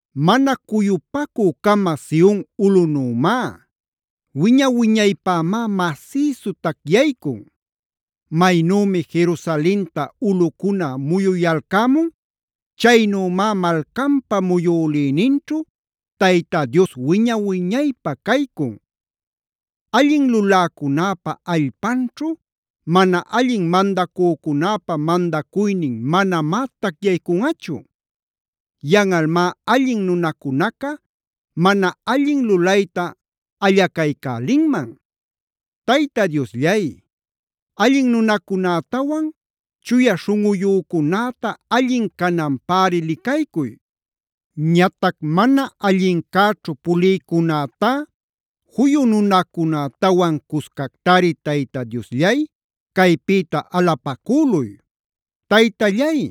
mana cuyupacü-cama Sion ulꞌunümá. Wiña-wiñaypämá masïsu tacyaycun. Maynümi Jerusalenta ulꞌucuna muyuyalcämun, chaynümá malcanpa muyülïninćhu Tayta Dios wiña-wiñaypä caycun. Allin luläcunäpa allpanćhu mana allin mandacücunäpa mandacuynin manamá tacyaycunꞌachu. Yanꞌalmá allin nunacunaca mana allin lulayta allacaycälinman. Tayta Diosllay, allin nunacunätawan chuya śhunꞌuyücunäta allin cananpäri licaycuy. Ñatac mana allincäćhu pulïcunätá juyu nunacunätawan cuscactari Tayta Diosllay, caypïta alapacüluy. Taytallay,